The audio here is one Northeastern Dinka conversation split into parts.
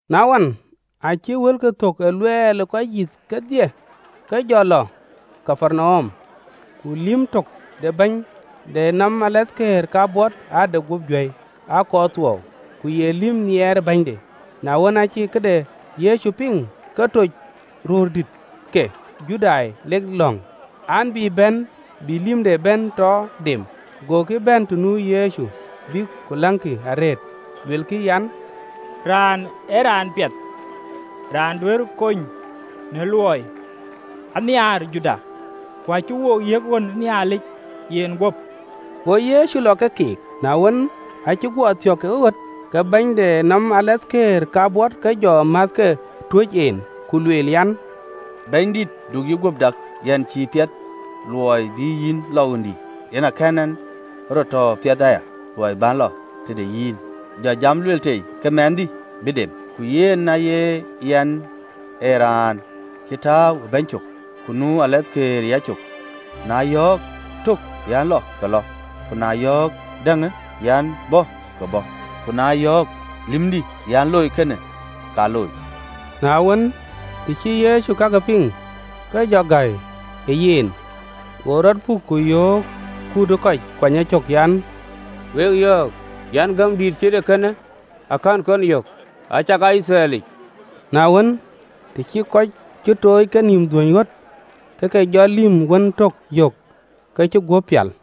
Na wën, aacï wëlkï thok ë luɛl ë kɔc yïth kedhie, ke jɔ lɔ Kapernaum. Ku lïm tök de bɛ̈ny de nɔm alathkëër kabɔt ade guöp juäi, akɔɔr thuɔɔu, ku ye lïm nhiɛɛr bɛ̈nyde. Na wën, acï këde Yecu piŋ, ke toc röördït ke Judai, lek lɔ̈ŋ an, bï bɛ̈n bï lïmde bɛ̈n tɔ dem. Gokï bɛ̈n tɔ nu Yecu, bïk ku läŋkï arëët, luelkï an, “Raanë ee raan piɛth raan duɛ̈ɛ̈rë kony në luɔɔiyë. Anhiaar jurda, ku acï wo yiëk ɣön ë Nhialic yen guöp.” Go Yecu lɔ ke keek. Na wën, aacï guɔ thiɔ̈k ke ɣöt, ke bɛ̈ny de nɔm alathkëër kabɔt ke jɔ määthke tuöc en, ku lueel an, “Bɛ̈nydït, du yïguöp dak: yɛn cïï piɛth luɔi bï yïn bɛ̈n ɣöndï, yen aa kɛ̈n ɛn rɔt tɔ piɛth aya luɔi bän lɔ tëde yïn: jɔ jam lueel tei, ke lïmdï bï dem. Ku yɛn aya yɛn ee raan cï tääu ë bäny cök, ku nu alathkëër ë yacök, na yɔ̈ɔ̈k tök an, ‘Lɔ!’ Ka lɔ, ku na yɔ̈ɔ̈k däŋ an, ‘Bä!’ Ka bɔ̈, ku na yɔ̈ɔ̈k lïmdï an, ‘Loi kënë,’ ka looi.” Na wën, të cï Yecu kakë piŋ, ke jɔ gäi ë yen, go rɔt puk, ku yöök kut ë kɔc kuany ecök an, “Wek yɔ̈ɔ̈k an, gäm dïït cït ee kënë akɛ̈n kɔn yök, acakaa Yithriɛlic!” Na wën, të cï tuuc kenïïm dhuöny ɣöt, ke ke jɔ lïm wën tök yök ke cï guöp pial.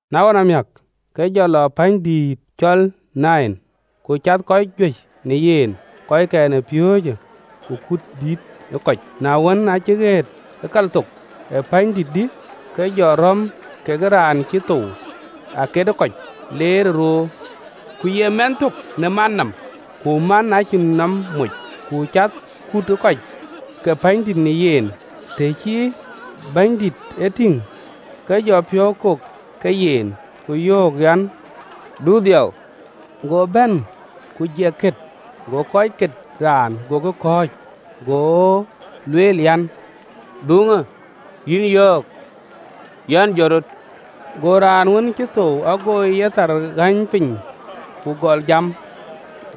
Na ɣɔn amiäk, ke jɔ lɔ pänydït cɔl Nain: ku cath kɔc juëc në yen, kɔckɛn ë piööcë, ku kut dït ë kɔc. Na wën, aacï ɣet ë kalthok ë pänydït dï, ke jɔ rɔ̈m ke raan cï thou aket ë kɔc, leerë roor, ku ye mɛnh tök në man nɔm, ku man acïn nɔm moc: ku cath kut ë kɔc ke pänydït në yen. Të cï Bɛ̈nydït e tïŋ, ke jɔ piɔ̈u kok ke yen, ku yöök an, “Du dhiau.” Go bɛ̈n ku jiɛk kët: go kɔc ket raan gokï kɔ̈ɔ̈c. Go lueel an, “Dhuŋë! Yïn yɔ̈ɔ̈k an, Jɔt rɔt!” Go raan wën cï thou ago yethar ɣäny piny, ku gɔl jam.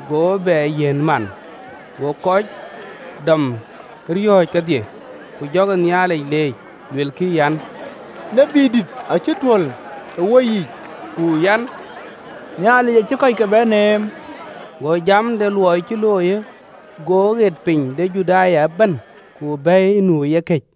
Go bɛ yiɛ̈n man. Go kɔc dɔm ë riɔ̈ɔ̈c kedhie: ku jɔkï Nhialic leec, luekï an, “Tiët dït acï tuöl ë woyiic! Nhialic acï kɔcke bɛ̈n neem!” Go jam de luɔi cï looiyë ɣet piny de Juda ëbɛ̈n, ku bɛ̈i nu ë yekëc.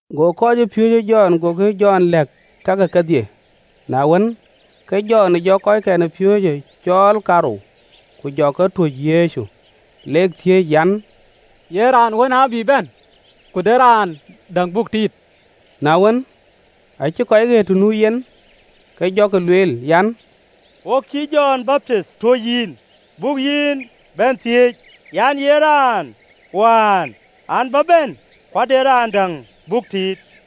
Go kɔcpiööcë Jɔn gokï Jɔn lɛ̈k kakë kedhie. Na wën, ke Jɔn jɔ kɔckɛn ë piööcë cɔɔl kaarou, ku jɔ ke tuöc Bɛ̈nydït, lek thiëëc an, “Ye raan wään an, bï bɛ̈n? Ku de raan däŋ buk tiit?” Na wën, aacï kɔc ɣet të nu yen, ke jɔkï lueel an, “Wok cïï Jɔn Baptith tuöc yïn, buk yïn bɛ̈n thiëëc, na ye raan wään an, bïï bɛ̈n? Ku de raan däŋ buk tit?”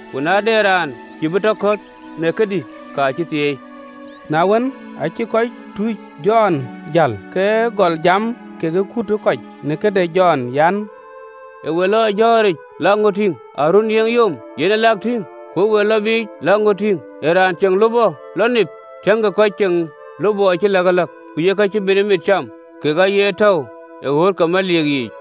Ku na de raan cïï piɔ̈u bï ŋït në këdï, ka bï thieei!” Na wën, aa cï kɔc tuucë Jɔn jäl, ke gɔl jam kekë kut ë kɔc në këde Jɔn, an, “Ë we lɔ jɔ̈ɔ̈ric lak ŋö tïŋ? Ee aruöör niŋë yom, yen ë lak tïŋ? Ku ë we lɔ biic lak ŋö tïŋ? Ee raan ceŋ lupɔ lɔ nip? Tiëŋkï, kɔc ceŋ lupɔ cï läkëläk, ku yek kak ë mitëmit cam, kek aye tɔ̈u ë ɣööt ke meliik yiic!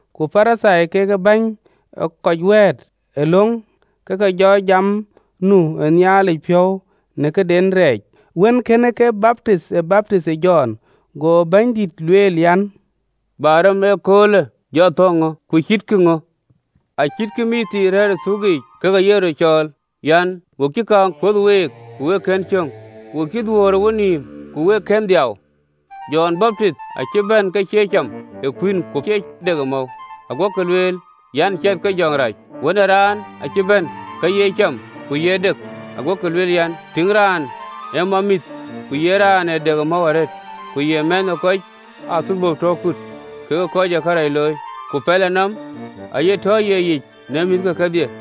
Ku Parithai kekë bäny ee kɔc wɛ̈ɛ̈t ë löŋ, ke ke jɔ jam nu ë Nhialic piɔ̈u në këden rɛɛc, wën kënë ke baptith ë baptinh ë Jɔn. Go Bɛ̈nydït lueel an, “Bä rem ë ëköölë jɔ thɔ̈ɔ̈ŋ ŋö? Ku cïtkï ŋö? Acïtkï mïththii rɛ̈ɛ̈r ë thuukic, ke ke ye röt cɔɔl an, ‘Wo cï kaaŋ kuöth week, ku wek kën cöŋ, wo cï dhuöör ë wenïïm, ku wek kën dhiau!’ Jɔn Baptith acï bɛ̈n ke cie cam ë kuïn ku cie dek ë mɔ̈u, aguɔkï lueel an, ‘Ciɛth ke jɔŋ rac!’ Wën ë Raan acï bɛ̈n ke ye cam ku ye dek, aguɔkï lueel an, “Tïŋ raanë, ee mamïïth ku ye raan ë dek ë mɔ̈u arëët, ku ye mɛ̈thë ë kɔc ë athölbö tɔ kut kekë kɔc ë kërac looi!’ Ku pɛlënɔm de Nhialic aye tɔ ye yic në mïthke kedhie.”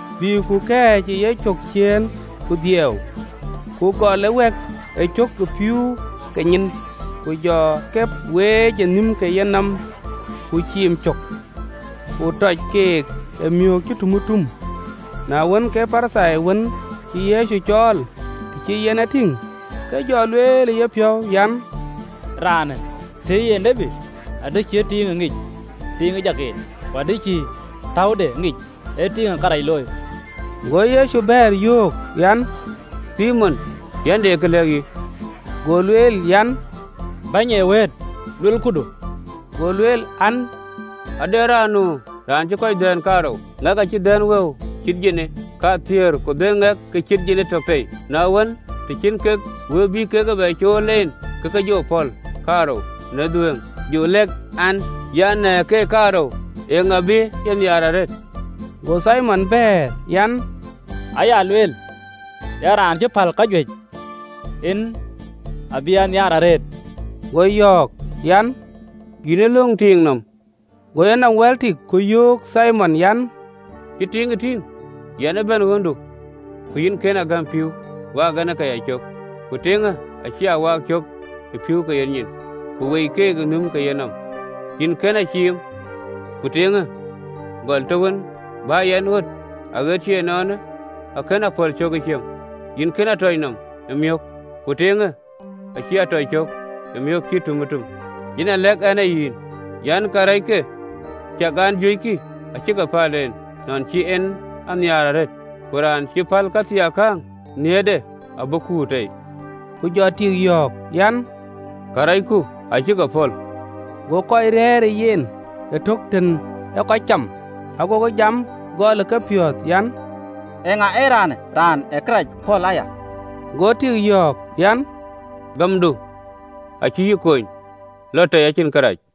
bï ku kɛ̈ɛ̈c ë yecök ciëën ke dhiau, ku gɔl ë wɛ̈k ëcök ë pïïu ke nyin, ku jɔ ke weec ë nhïm ke yenɔm, ku ciim cök, ku tɔc keek ë miök cï tumëtum. Na wën, ke Parithai wën cï Yecu cɔɔl, të cï en e tïŋ, ke jɔ lueel ë yepiɔ̈u an, “Raanë tëë ye tiët, adï cï tiiŋë ŋic, tiiŋ ë jak en, ku adï cï täude ŋic, ee tiiŋ ee kërac looi!” Go Yecu bɛ̈ɛ̈r, yöök an, “Thimon, yɛn de kë lɛ̈k yïn.” Go lueel an, “Bɛ̈ny ee wëët, luel këdu.” Go lueel an ade raan nu raan cï kɔc dhɛ̈ɛ̈n kaarou: ŋɛk acï dhɛ̈n wëu cït jinii kathiëër, ku ŋɛk ke cït jinii tök tei. Na wën, të cïn kek wëu bïk bɛ cuöl en, ke ke jɔ pɔ̈l kaarou në dhuëëŋ. Jɔ lɛ̈k ɛn an, “Në keek kaarou, eeŋa bï ye nhiaar arëët?” Go Thimon bɛ̈ɛ̈r an, “Aya lueel an, ee raan cï päl kajuëc, en abï ye nhiaar arëët.” Go yɔ̈ɔ̈k an, “Yïn ë löŋ tiiŋ nɔm.” Go yenɔm wɛ̈l tik, ku yöök Thimon an, “Cï tiiŋë tïŋ? Yɛn ë bɛ̈n ɣöndu, ku yïn kën a gäm pïïu waak ɛn ke yacök: ku tiiŋë acï a waak cök ë pïïu ke nyin, ku weec keek ë nhïm ke yenɔm. Yïn kën a ciim, ku tiiŋë, gɔl të wën bä yɛn ɣöt, aɣet cï ënɔɔnë akën a pɔ̈l cök ë ciëm. Yïn kën a tɔc nɔm ë miök: ku tiiŋë acï a tɔc cök ë miök cï tumëtum. Yen a lɛ̈k ɛn ë yïn an, “Karɛcke, aciɛk an, juëckï, acï ke päl en, nɔn cï en a nhiaar arëët: ku raan cï päl këthiinakäŋ, nhiëërde abï kuur tei.” Ku jɔ tik yɔ̈ɔ̈k an, “Karɛcku acï ke pɔ̈l.” Go kɔc rɛ̈ɛ̈r ë yen ëtök tën ee kɔc cam, agokï jam gɔl ë kepiɔ̈ɔ̈th an, “Eeŋa ëraanë raan ë karɛc pɔ̈l aya?” Go tik yɔ̈ɔ̈k an, “Gämdu acï yï kony, lɔ tei, acïn kërac.”